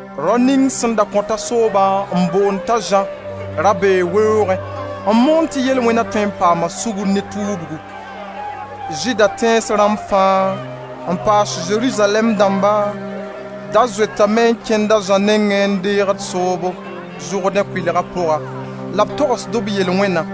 Rao ning sẽn da kõta soobo n boond t'a Zã, ra bee weoogẽ, n moond tɩ yel-wẽna tõe n paama sugri ne tuubgu. Zɩɩda tẽns rãmb fãa, n paas Zerizalɛɛm dãmba da zoetame n kẽnd a Zã nengẽ n deegd soobo, Zʋrdẽ kʋɩlga pʋga, la b togsd b yel-wẽna.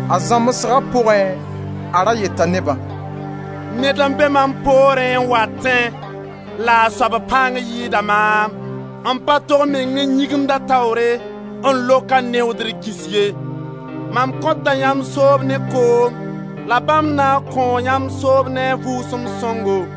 A zãmsga pʋgẽ, a ra yeta nebã: «Ned n be mam poorẽ n watẽ la a soab pãng yɩɩda maam. M pa tog meng n yĩgimd a taoore n lok a neoodr gĩsg ye. Mam kõta yãmb soob ne koom la bãmb na n kõo yamb soob ne a Vʋʋsem Sõngo.»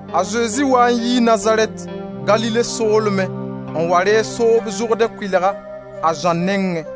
A Zezi waa n yii Nazarɛt, Galile soolmẽ, n wa reeg soob Zʋrdẽ kʋɩlga, a Zã nengẽ.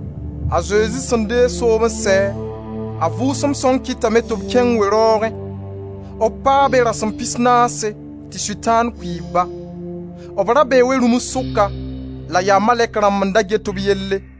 A Zezi sẽn deeg soob n sɛ, a Vʋʋsem Sõng kɩtame tɩ b kẽng we-raoogẽ. B paa be rasem pisnaase tɩ Sʋtãan kʋɩɩb-ba. B ra bee we-rũms sʋka, la yaa malɛk rãmb n da get b yelle.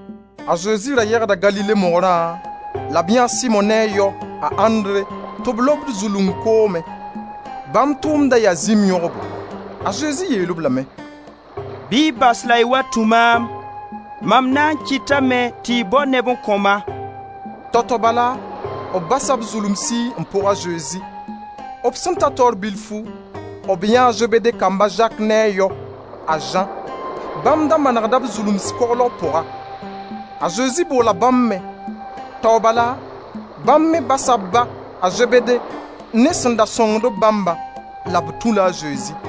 A Zezi ra yegda Galile mogrã, la b yãee a Simo ne a yao, a Andre tɩ b lobd zulung koomẽ. Bãmb tʋʋmd da yaa zĩm yõgbo. A Zezi yeel-b lame: «Bɩ y bas la y wa tũ maam; mam na n kɩtame tɩ y bao neb n kõ-ma.» Tao-tao bala, b basa b zulumsi n pʋg a Zezi. B sẽn ta taoor bilfu, b yãee a Zebede kamba, a Zak ne a yao, a Zã. Bãmb da manegda b zulumsi koglg pʋga. A Zezi boola bãmb me, tao bala bãmb me basa b ba, a Zebede, ne sẽn da sõngd-b bãmbã, la b tũ-la a Zezi.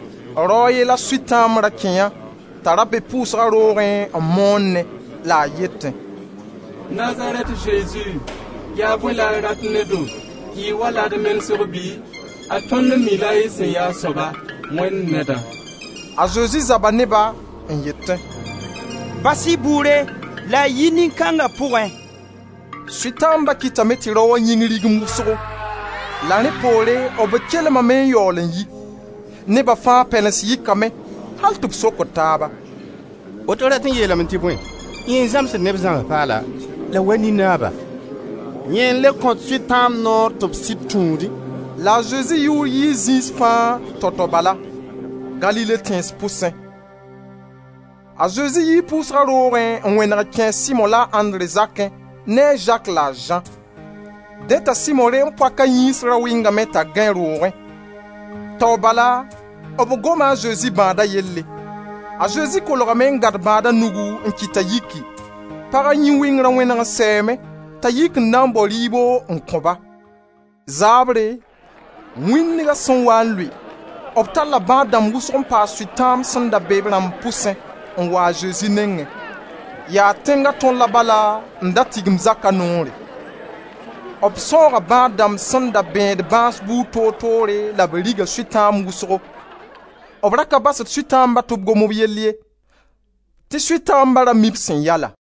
Rao a ye la Sʋtãamb ra kẽ yã t'a ra be pʋʋsga roogẽ n moonẽ la a yetẽ: «Nazarɛt Zezi, yaa bõe la y rat ne-do? Y wa-la d menesg bɩ? Ad tõnd mi-la y sẽn yaa a soaba: Wẽnd Nedã.» A Zezi zaba ne-ba, n yetẽ: «Bas-y bʋʋre la y yi nin-kãnga pʋgẽ.» Sʋtãamba kɩtame tɩ raoã yĩng rigimd wʋsgo. La rẽ poore b kelmame n yaool n yi. Neba fãa pɛlens yɩkame, al tɩ b sokd taaba: «Woto rat n yeelame tɩ bõe? Yẽ n zãmsd neb zãms paala, la wa nin-naaba; yẽ n le kõt Sʋtãamb noor tɩ b sɩd tũudẽ!» La a Zezi yʋʋr yii zĩis fãa, tao-tao bala, Galile tẽns pʋsẽ. A Zezi yii pʋʋsga roogẽ n wẽneg n kẽ a Simo la a Andre zakẽ ne a Zak la a Zã. Dẽ t'a Simo reem-poaka yĩns da wɩngame t'a gãe roogẽ; tao bala b goma a Zezi bãada yelle. A Zezi kolgame n gãd bãada nugu n kɩt t'a yiki. Paga yĩn-wɩngra wẽneg n sɛɛme t'a yik n na n bao rɩɩbo n kõ-ba. Zaabre, wĩndga sẽn waa n lʋɩ, b talla bãad dãmb wʋsgo n paas Sʋtãamba sẽn da be b rãmb pʋsẽ n wa a Zezi nengẽ. Yaa tẽnga tõr la bala n da tigim zaka noore. B sãooga bãad-dãmb sẽn da bẽed bãas buud toor toore la b riga Sʋtãamb wʋsgo. B ra ka basd Sʋtãamba tɩ b gom b yell ye tɩ Sʋtãamba ra mii b sẽn ya-la.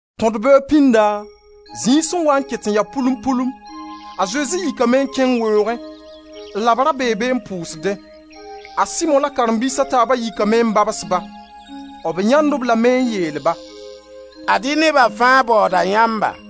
Tõd-beoog pĩnda, zĩig sẽn waa n ket n ya pʋlum-pʋlum, a Zezi yikame n kẽng weoogẽ la b ra bee be n pʋʋsdẽ. A Simo la karen-biis a taaba yikame n babs-ba. B yãend-b lame n yeel-ba: «Ad-y neba fãa baooda yãmba.»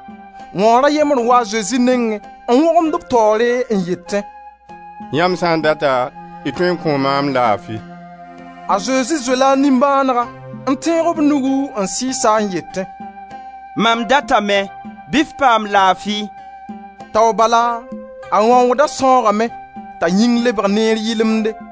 Wãoor a yembre n waa a Zezi nengẽ n wõgemd b taoore n yetẽ: «Yãmb sã n data y tõe n kõo maam laafi.» A Zezi zoela a nimbãanega n tẽeg b nugu n sɩɩs-a n yetẽ: «Mam datame, bɩ f paam laafi!» Tao bala a wãooda sãoogame t'a yĩng lebg neer yɩlemde.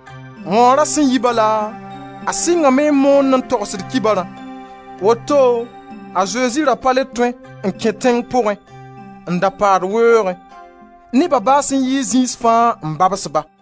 Wãoora sẽn yi bala, a sɩngame n moone n togsd kibarã. Woto a Zezi ra pa le tõe n kẽ tẽng pʋgẽ, n da paad weoogẽ. Neba baas n yi zĩis fãa n babs ba.